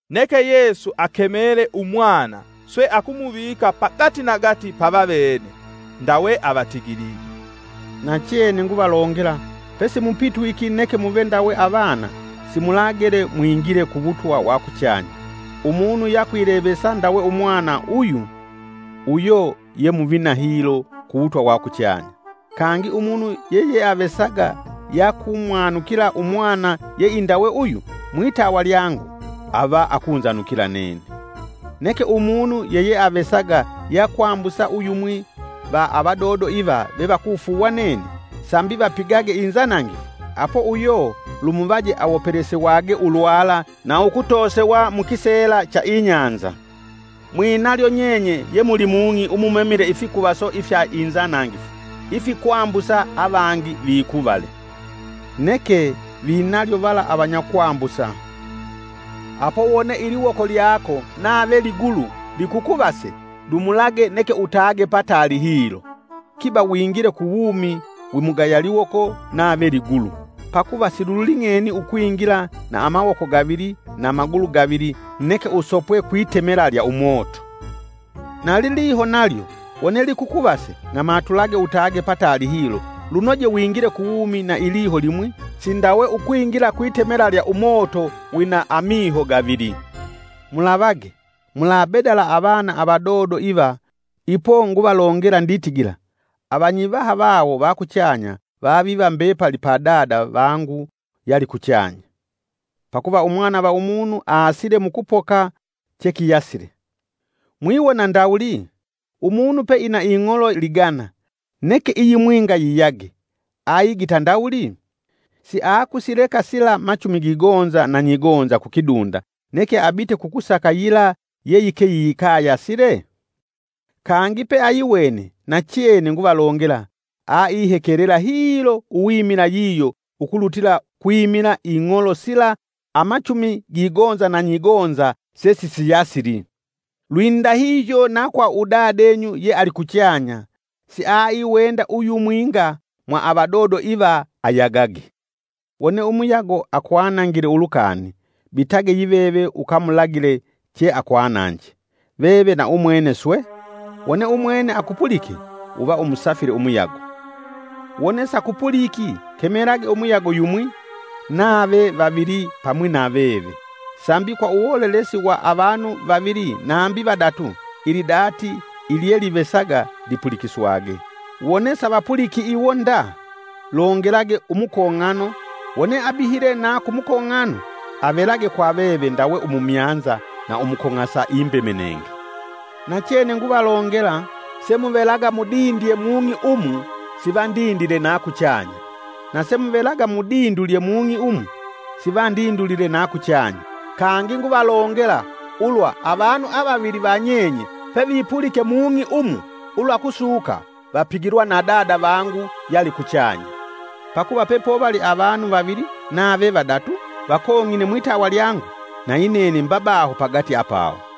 Neke Yesu akemele Umwana swe akumuvika pagatinagati pavavene. Ndawe avatigilige, “Nachene nguvalongela pesimupitwiki neke muve ndawe avana simulagele mwingile ku wutwa wa kuchanya. Umunu yakwilevesa ndawe umwana uyu, uyo ye muvina hilo ku wutwa wa kuchanya. Kangi Umunu yeyeavesaga yakumwanukila Umwana yeindawe uyu mwitawa lyangu, ava akunzanukila nene. “Neke umunu yeyeavesaga yakwambusa uyumwi va avadodo iva vevakufuuwa nene sambi vapigage inzanangifu nene apo uyo lumuvaje awopelesewage ulwala na ukutoosewa mukiseela cha ibahali. Mwinalyo nyenye ye muli mung'i umumemile ifikuvaso ifya inzanangifu ifikwambusa avangi vikuvale! Neke vinalyo vala avanyakwambusa! “Apo wone iliwoko lyako nave ligulu likukuvase dumulage neke utage pataali hilo, kiba wingile ku uwumi wimugaya liwoko nave ligulu, pakuva siluling'eni ukwingila na amawoko gavili na magulu gavili neke usopwe kwitemela lya umoto. Na liliho nalyo wone likukuvase ng'amatulage neke pataali hilo lunoje wingile ku wumi na iliho limwi sindawe ukwingila kwitemela lya umoto wina amiho gavili. “Mulavage! Mulabedala avana avadodo iva, ipo nguvalongela nditigila avanyivaha vawo va kuchanya vaviva mbepali pa Dada vangu yalikuchanya. [ Pakuva Umwana va Umunu asile mukupoka chekiyasile.] Mwiwona ndawuli? Umunu peina ing'olo ligana, neke iyimwinga yiyage, aigita ndawuli? Siakusileka sila machumi gigonza na nyigonza kukidunda neke abite kukusaka yila yeyike yikayasile? Kangi peayiwene nachene nguvalongela aihekelela hilo uwimila yiyo ukulutila kwimila ing'olo sila amachumi gigonza na nyigonza sesisiyasili. Lwindahihyo na kwa udadenyu yealikuchanya siaiwenda uyumwinga mwa avadodo iva ayagage. “Wone umuyago akwanangile ulukani, bitage yiveve ukamulagile che akwananje, veve na umwene swe, wone umwene akupulike, uva umusafile umuyago. Wone, sakupuliki, kemelage umuyago yumwi, nave vavili pamwi na veve sambi kwa uwolelesi wa avanu vavili nambi vadatu, ilidati ilyelivesaga lipulikiswage. Wone, savapuliki iwo nda, longelage umukong'ano, wone abihile na kumukong'ano avelage kwa veve ndawe umumyanza na umukong'asa imbemenenge. “Nachene nguvalongela semuvelaga mudindye mung'i umu sivandindile na kuchanya, na semuvelaga mudindulye mung'i umu sivandindulile na kuchanya. Kangi nguvalongela ulwa avanu avavili va nyenye pevipulike mung'i umu ulwakusuka, vapigilwa na Dada vangu yalikuchanya. Pakuva pepovali avanu vavili nave vadatu vakong'ine mwitawa lyangu, nayinene mba baho pagati apawo.”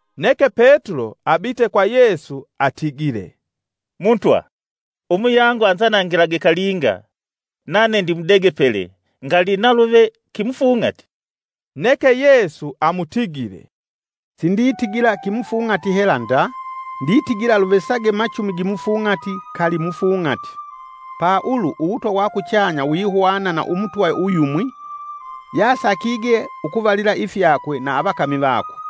Neke Petulo abite kwa Yesu atigile, “Mutwa, umuyangu anzanangilage kalinga nane ndimudegepele ngali naluve kimufung'ati?” Neke Yesu amutigile, “Sinditigila kimufung'ati hela nda, nditigila luvesage machumi gimufung'ati kali mufung'ati. Pa ulu uwutwa wa kuchanya wihwana na umutwa uyumwi yasakige ukuvalila ifyakwe na avakami vakwe.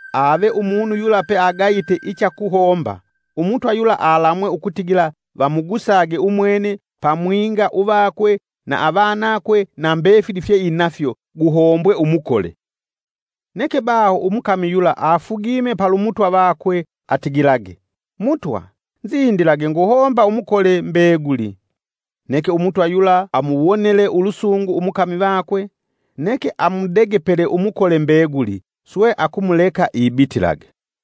Ave umunu yula pe agayite ichakuhomba, umutwa yula alamwe ukutigila vamugusage umwene pamwinga uvakwe na avanakwe na mbefili fyeeinafyo guhombwe umukole. Neke baho umukami yula afugime palu Mutwa vakwe atigilage, ‘Mutwa nzindilage nguhomba umukole mbeguli.’ Neke Umutwa yula amuwonele ulusungu umukami vakwe, neke amudegepele umukole mbeguli swe akumuleka ibitilage.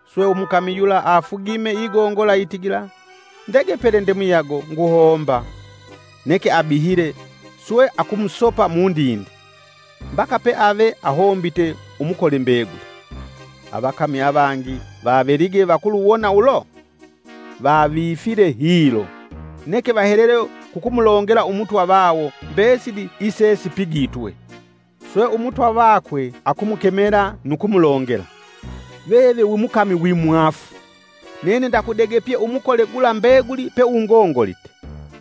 Swe umukami yula afugime igongola itigila, ‘Ndegepele ndemuyago nguhomba.’ Neke abihile, swe akumusopa mundinde, ‘Mbaka peave ahombite umukole mbeguli.’ Avakami avangi vavelige vakuluwona ulo, vavifile hilo, neke vahelele kukumulongela Umutwa vawo mbesili isesipigitwe. Swe Umutwa vakwe akumukemela nu kumulongela, ‘Veve wi mukami wi mwaafu!’ Nene ndakudegepye umukole gula mbeguli peungongolite.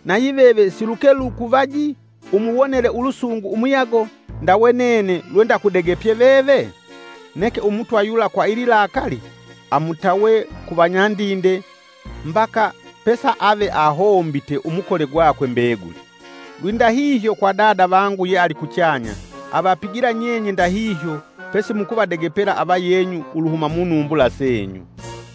Na yiveve siluke lukuvaji umuwonele ulusungu umuyago, ndawe nene lwendakudegepye veve? Neke Umutwa yula kwa ililakali, amutawe ku vanyandinde mbaka pesaave ahombite umukole gwakwe mbeguli. Lwindahihyo kwa Dada vangu yealikuchanya avapigila nyenye ndahihyo pesimukuvadegepela avayenyu uluhuma munumbula senyu.”